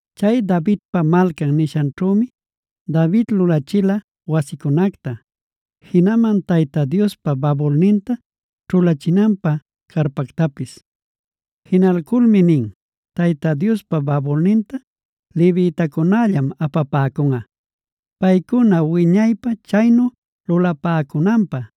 Chay Davidpa Malcan nishanćhümi David lulachila wasicunacta, jinaman Tayta Diospa babulninta ćhulachinanpä carpactapis. Jinalculmi nin: “Tayta Diospa babulninta levitacunällam apapäcunꞌa. Paycuna wiñaypä chaynu lulapäcunanpä,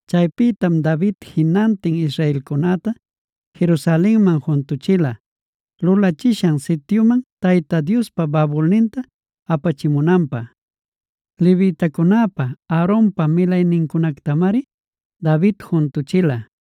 Chaypïtam David jinantin israelcunäta Jerusalenman juntüchila, lulachishan sityuman Tayta Diospa babulninta apachimunanpä. Levitacunäpa, Aaronpa milaynincunactamari David juntüchila: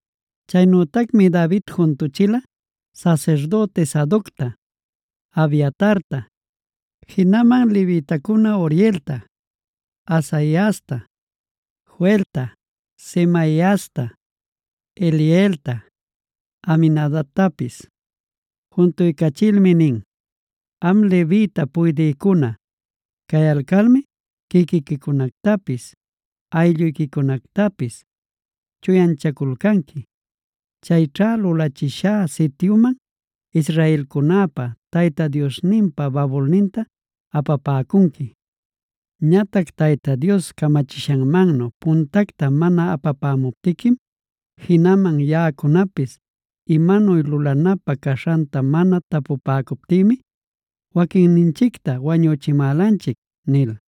Chaynütacmi David juntüchila sasirdüti Sadocta, Abiatarta, jinaman levitacuna Urielta, Asaiasta, Joelta, Semaiasta, Elielta, Aminadabtapis. Juntulcachilmi nin: “Am levita puydïcuna cayalcalmi, quiquiquicunactapis aylluyquicunactapis chuyanchaculcanqui. Chayćha lulachishá sityuman israelcunäpa Tayta Diosninpa babulninta apapäcunqui. Ñatac Tayta Dios camachishanmannu puntacta mana apapämuptiquim, jinaman yaꞌacunapis imanuy lulanapä caśhanta mana tapupäcuptïmi waquinninchicta wañüchimälanchic” nil.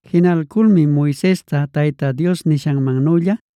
Jinalculmi Moisesta Tayta Dios nishanmannülla,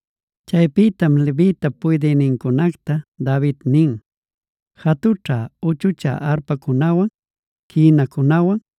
Chaypïtam levitap puydïnincunacta David nin: “Jatućhä-uchuchä arpacunawan, quïnacunawan,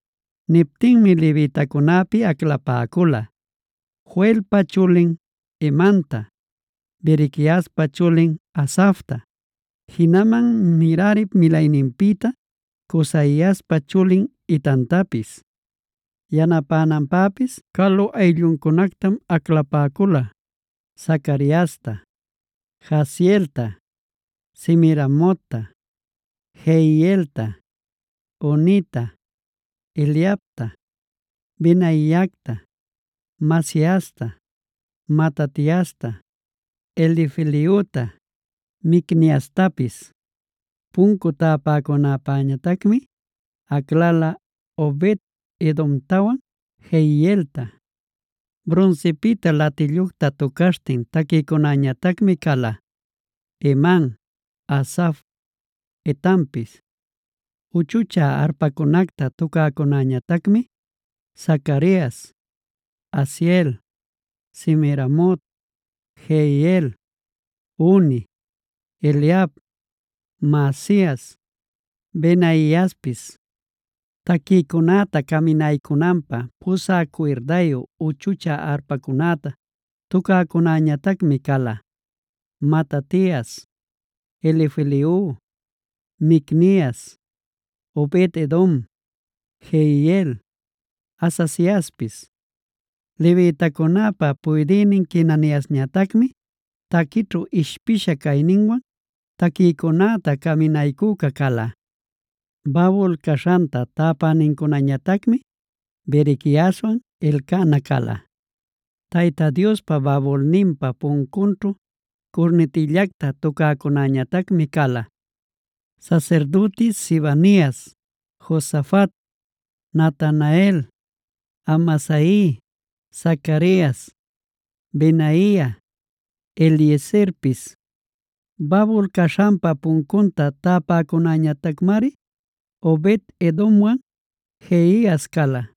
Niptinmi levitacunapi aclapäcula: Joelpa chulin Hemanta, Berequiaspa chulin Asafta, jinaman Merarip milayninpïta Cusaiaspa chulin Etantapis. Yanapänanpäpis calu aylluncunactam aclapäcula: Zacariasta, Jaazielta, Semiramotta, Jehielta, Unita, Eliabta, Benaiata, Maasiasta, Matatiasta, Elifelehuta, Micniastapis. Puncu täpäcunäpäñatacmi aclala Obed-edomtawan Jeielta. Brunsipïta latillucta tucaśhtin taquïcunäñatacmi cala: Heman, Asaf, Etanpis. Uchuchä arpacunacta tucäcunäñatacmi: Zacarias, Aziel, Semiramot, Jehiel, Uni, Eliab, Maasias, Benaiaspis. Taquïcunäta caminaycunanpä pusä cuirdayu uchuchä arpacunäta tucäcunäñatacmi cala: Matatias, Elifelehu, Micnias, Obed-edom, Jeiel, Azaziaspis. Levitacunäpa puydïnin Quenaniasñatacmi taquićhu ishpisha cayninwan taquïcunäta caminaycüca cala. Babul caśhanta täpänincunañatacmi Berequiaswan Elcana cala. Tayta Diospa babulninpa puncunćhu curnitillacta tucäcunäñatacmi cala: Sasirdüti Sebanias, Josafat, Natanael, Amasai, Zacarias, Benaia, Eliezerpis. Babul caśhanpa puncunta täpäcunäñatacmari Obed-edomwan Jehias cala.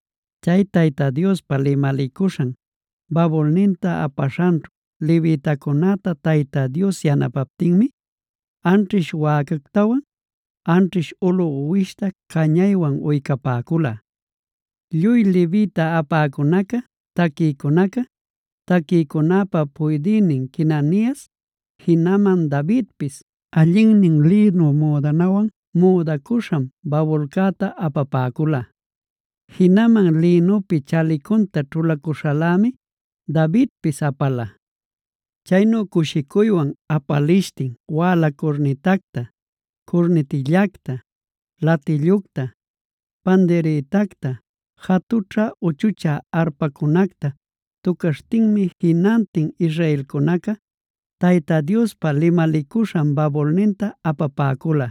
Chay Tayta Diospa limalicuśhan babulninta apaśhanćhu, levitacunäta Tayta Dios yanapaptinmi, anćhish wäcactawan anćhish ulu uwishta cañaywan uycapäcula. Lluy levita apäcunaca, taquïcunaca, taquïcunäpa puydïnin Quenanias, jinaman Davidpis allinnin lïnu müdanawan müdacüśham babulcäta apapäcula. Jinaman lïnupi chalicunta ćhulacuśhalämi Davidpis apala. Chaynu cushicuywan apalishtin wäla curnitacta, curnitillacta, latillucta, pandirïtacta, jatućhä-uchuchä arpacunacta tucaśhtinmi jinantin israelcunaca Tayta Diospa limalicuśhan babulninta apapäcula.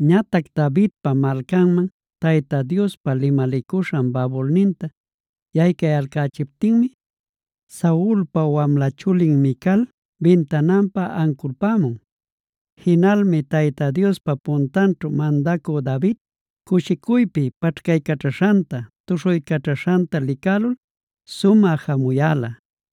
Ñatac Davidpa Malcanman Tayta Diospa limalicuśhan babulninta yaycayalcächiptinmi, Saulpa wamla chulin Mical bintananpa anculpämun. Jinalmi Tayta Diospa puntanćhu mandacü David cushicuypi paćhcaycaćhaśhanta, tuśhuycaćhaśhanta licälul sumä jamuyäla.